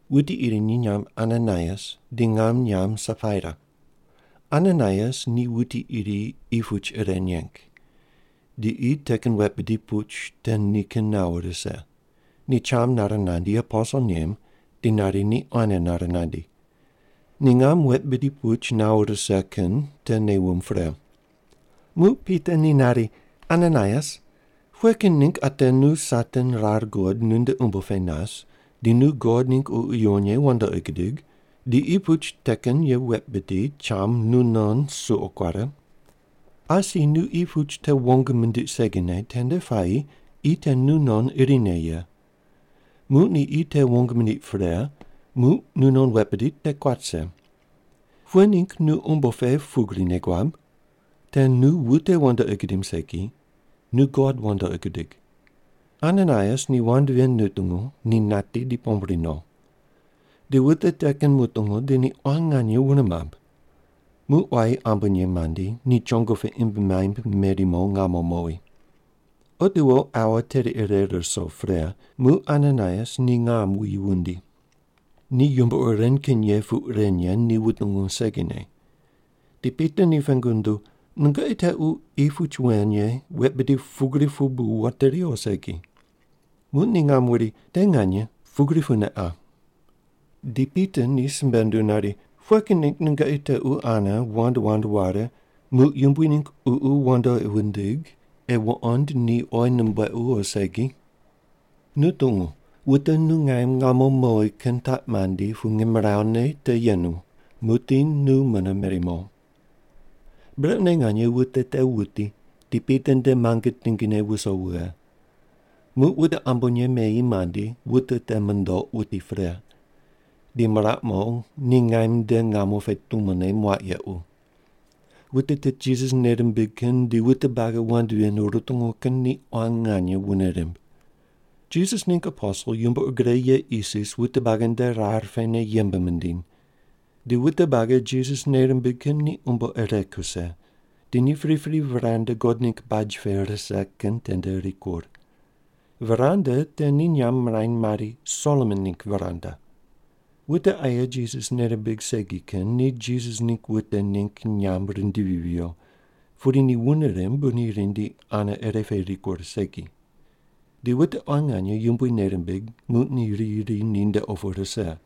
Wuti iri ni nyamb Ananaias, di ngam nyamb Sapaira. Ananaias ni wuti iri qi puch ire neng. Di qi te kin wet bidi puch te nikin nawo rise. Ni cham nare nandi aposel nem di nari ni quane nare nandi. Ni ngam wet bidi puch nawo rise kin te nei wumb pre. Muq Pita ni nari, “Ananaias, pughe kin ningg ate nu Satan rar guqoid nunde umbo pe nas, di nu God ningg Ququ Yuwon Ye wandoqi gudig, di qi puch te kin ye wet bidi cham nunon suqo kuare? Asi ni qi puch te wong mindiq segine tende puayi qi te nu non irine ye. Muq ni qi te wong mindiq pre, muq nu non wet bidi te kuat rise. Pughe ningg nu umbo pe pugri nei guab? Te nu wute wandoqi gudim segi. Nu God wandoqi gudig.” Ananaias ni wand ven nutungu, ni nati di pombri no. Di wute te kin mutungu, di ni quan nganye wune mamb. Muq quayi ambonye mandi, ni chongo pe imb maimb meri mo ngamo mowi. Otiwo aua teri ire ruso pre, muq Ananaias ni ngam wuyi wundi. Ni yumbo ur ren kin ye puq ren ye ni wutungu segine. Di Pita ni pengu nunduw, “Nungoqi tequ qi puch wen ye wet bidi pugri pu bu wateri o segi?” Muq ni ngam wuri, “Te nganye. Pugri pune qa.” Di Pita ni simbe nunduw nari, “Pughe kin ningg nungoqi tequ ane wand wand ware, muq Yumbui ningg Ququ wandoqi wundig, ei wuqond ni oyi numbuequ o segi? Nu tungu, wute nu ngaim ngamo mowi kin taq mandi pu ngimrawu ne te yemu. Muqdi nu mune meri mo.” Brequne nganye wute te wuti, di Pita nde muange tingine wuso wughe. Muq wute ambonye meyi mandi, wute te mundoq, wuti pre. Di miraq mo, ni ngaim nde ngamo pe tumone muaq yequ. Wute tit Jisas nei rimbig kin di wute buagi wand ven rutungu kin ni quan nganye wune rimb. Jisas ningg aposel yumbo ur gre ye isis wute buagi nde rar pene yembe mindiny. Di wute buagi Jisas nei rimbig kin ni umbo ire kuse, di ni pripri veranda God ningg baj pe rise kin tende rikur. Veranda te ni nyamb mirany mari, “Solomon ningg veranda.” Wute aye Jisas nei rimbig segi kin ni Jisas ningg wute ningg nyamb rindivi viyo, pudi ni wune rimb bu ni rindi ane ire pe rikur segi. Di wute quan nganye Yumbui nei rimbig, muq ni riyi ri ninde opu rise.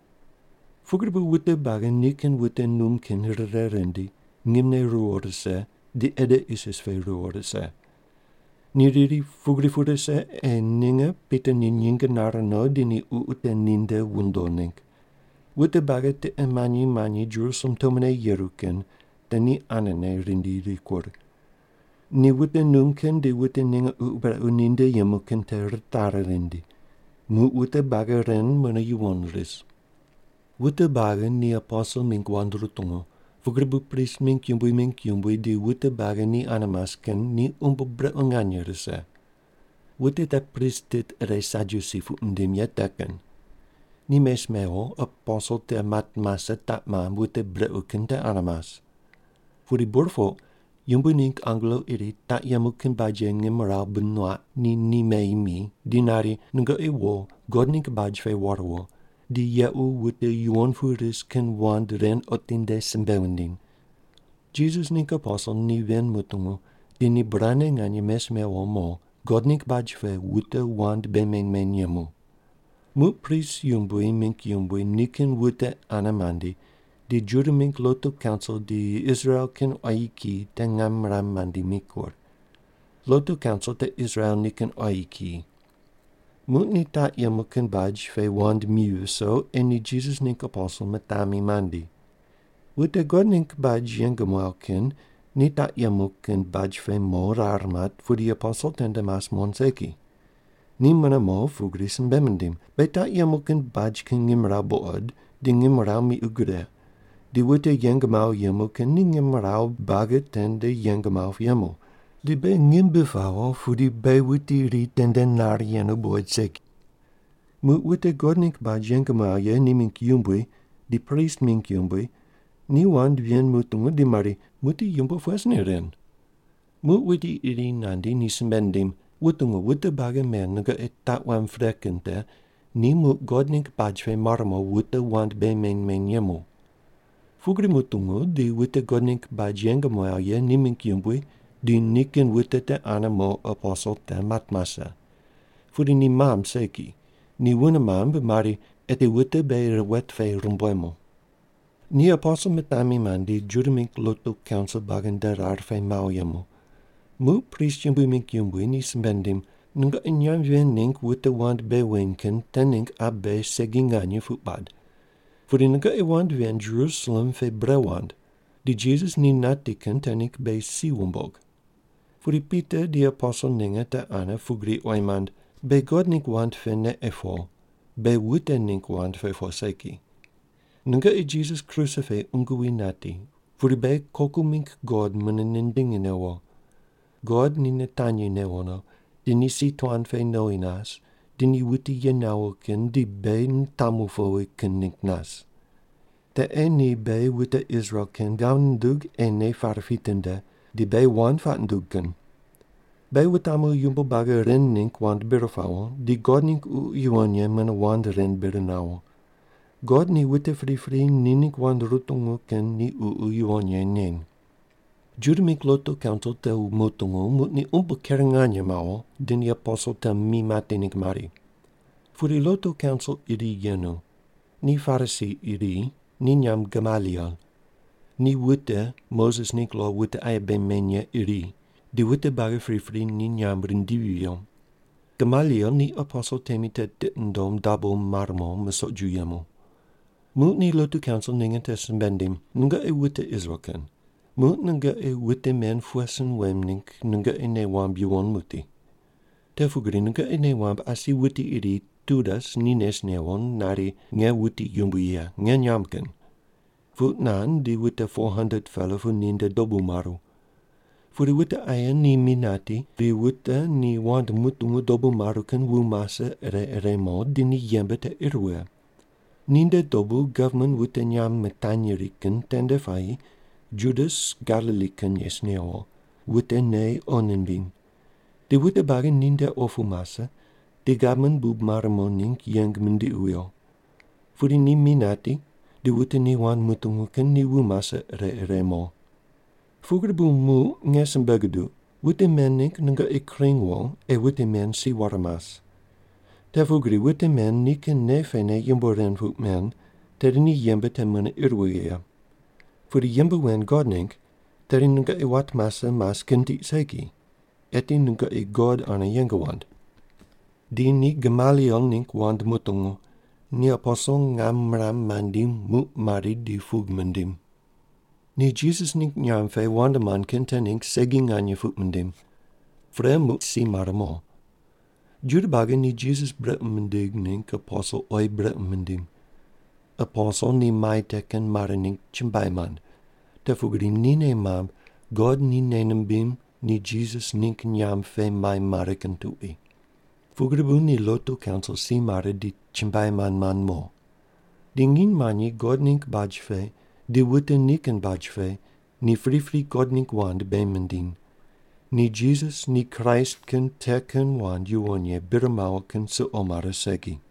Pugri bu wute buagi nikin wute num kin rire rindi, ngimne ruwo rise, di ede isis pe ruwo rise. Ni riri, pugri pu rise, ei ninge Pita ni nyinge nare no di ni ququ te ninde wundo ningg. Wute buagi tiqe manyi manyi Jerusalem tumone yeru kin te ni anene rindi rikur. Ni wute num kin di wute ninge ququ brequ ninde yemu kin te ritari rindi. Muq wute buagi ren mune yuwon ris. Wute buagi ni aposel mingg wand rutungu. Pugri bu prist mingg yumbui mingg yumbui di wute buagi ni ane mas kin ni umbo brequ nganye rise. Wute te prist tit ire Sadyusi puq mindim ye te kin. Ni mes mewo, aposel te mat mase taq mamb wute brequ kin te ane mas. Pudi burpoq Yumbui ningg angelo iri taq yemu kin baj ye ngimrawu bi nuaq, ni ni meyi mi, di nari, “Nungoqi wo, God ningg baj pe war wo, di yequ wute yuwon pu ris kin wand ren otinde simbe wundiny.” Jisas ningg aposel ni ven mutungu, di ni burane nganye mes mewo mo, God ningg baj pe wute wand bei meny meny yemu. Muq prist yumbui mingg yumbui nikin wute ane mandi, di Juda mingg lotu kaunsil di Israel kin quayi kiyi te ngam miram mandi mikur. Lotu kaunsil te Israel nikin quayi kiyi. Muq ni taq yemu kin baj pe wand mi viso, ei ni Jisas ningg aposel mitami mandi. Wute God ningg baj yeng muaw kin ni taq yemu kin baj pe mo rar mat, pudi aposel tende mas muqond segi. Ni mune mo, pugri simbe mindim, “Beghi taq yemu kin baj kin ngimrawu buqod, di ngimrawu miqu gre, di wute yeng mawo yemu kin ni ngimrawu buagi tende yeng mawo pu yemu. Di beghi ngim bi pawo, pudi beghi wuti iri tende nar yenu buqoid segi.” Muq wute God ningg baj yeng muaw ye ni mingg yumbui di prist mingg yumbui ni wand ven mutungu di mari, “Muqdi yumbo pughe sin ei ren?” Muq wuti iri nandi ni simbe nindim, “Wutungu, wute buagi men nungoqi taq wamb pre kin te ni muq God ningg baj pe mar mo wute wand bei meny meny yemu.” Pugri mutungu, di wute God ningg baj yeng muaw ye ni mingg yumbui di nikin wute te ane mo aposel te mat mase. Pudi ni mamb segi. Ni wune mamb di mari, “Eti wute beghi wet pe rumbuemu.” Ni aposel mitami mandi Juda mingg lotu kaunsil buagi nde rar pe mawo yemu. Muq prist yumbui mingg yumbui ni simbe nindim, “Nungoqi nyamb ven ningg wute wand bei weny kin te ningg qa beghi segi nganye puq bad. Pudi nungoqi wand ven Jerusalem pe bre wand. Di Jisas ni nati kin te ningg beghi si wumbog.” Pudi Pita di aposel ninge te ane pugri oyi mand, “Beghi God ningg wand pene ei po. Beghi wute ningg wand pe po segi. Nungoqi Jisas kruse pe qungu wi nati, pudi beghi koku mingg God mune nindingi newo. God ni nitanyi newo no, di ni si tuan pe nowi nas di ni wuti ye nawo kin di beghi nitamu powi kin ningg nas. Te ei ni beghi wute Israel kin ghav nundug ei nei pare pitinde, di beghi wand puaq nundug kin. Beghi wutamu yumbo buagi ren ningg wand bir pawo, di God ningg Ququ Yuwon Ye mune wand ren bir nawo. God ni wute pripri ni ningg wand rutungu kin ni Ququ Yuwon Ye neny.” Juda mingg lotu kaunsil te mutungu, muq ni umbo ker nganye mawo, di ni aposel te mi mati ningg mari. Pudi lotu kaunsil iri yenu. Ni Parisi iri, ni nyamb Gamaliel. Ni wute Moses ningg lo wute aye bei meny ye iri, di wute buagi pripri ni nyamb rindivi viyo. Gamaliel ni aposel temi te tiqi nundom dabo mar mo musoq ju yemu. Muq ni lotu kaunsil ninge te simbe nindim, “Nungoqi wute Israel kin, muq nungoqi wute men pughe sin wem ningg nungoqi nei wamb yuwon muqdi. Te pugri nungoqi nei wamb asi wuti iri Teudas ni nes newo, nari, ‘Nge wuti yumbui ye, nge nyamb kin.’ Puq nand di wute 400-pela pu ninde dobu maru. Pudi wute aye ni mi nati, di wute ni wand mutungu dobu maru kin wu mase ire ire mo, di ni yembe te ir wughe. Ninde dobu gavman wute nyamb mitanyri kin tende puayi Judas Galili kin nes newo, wute nei qo nimbiny. Di wute buagi ni nde opu mase, di gavman bub mare mo ningg yeng mindiqi wuyo. Pudi ni mi nati, di wute ni wand mutungu kin ni wu mase ire ire mo. Pugri bu muq nge simbe guduq, wute men ningg nungoqi kring wo ei wute men si ware mas. Te pugri wute men nikin nei pene yumbo ren puq men, tedi ni yembe te mune ir wughe ye. Pudi yembe wen God ningg tedi nungoqi wat mase mas kin tiq segi. Eti nungoqi God ane yeng wand.” Di ni Gamaliel ningg wand mutungu. Ni aposel ngam miram mandi muq mari di pug mindim. Ni Jisas ningg nyamb pe wand mand kin te ningg segi nganye puq mindim. Pre muq si mare mo. Juda buagi ni Jisas brequ mindig ningg aposel oyi brequ mindim. Aposel ni mai te kin mare ningg chumbuai mand, te pugri ni nei mamb God ni nei nimbim ni Jisas ningg nyamb pe mai mare kin tuqui. Pugri bu ni lotu kaunsil si mare di chumbuai mand mand mo. Di nginy manyi God ningg baj pe di wute nikin baj pe ni pripri God ningg wand bei mindiny. Ni Jisas ni Kraist kin te kin wand yuwon ye bir mawo kin suqo mare segi.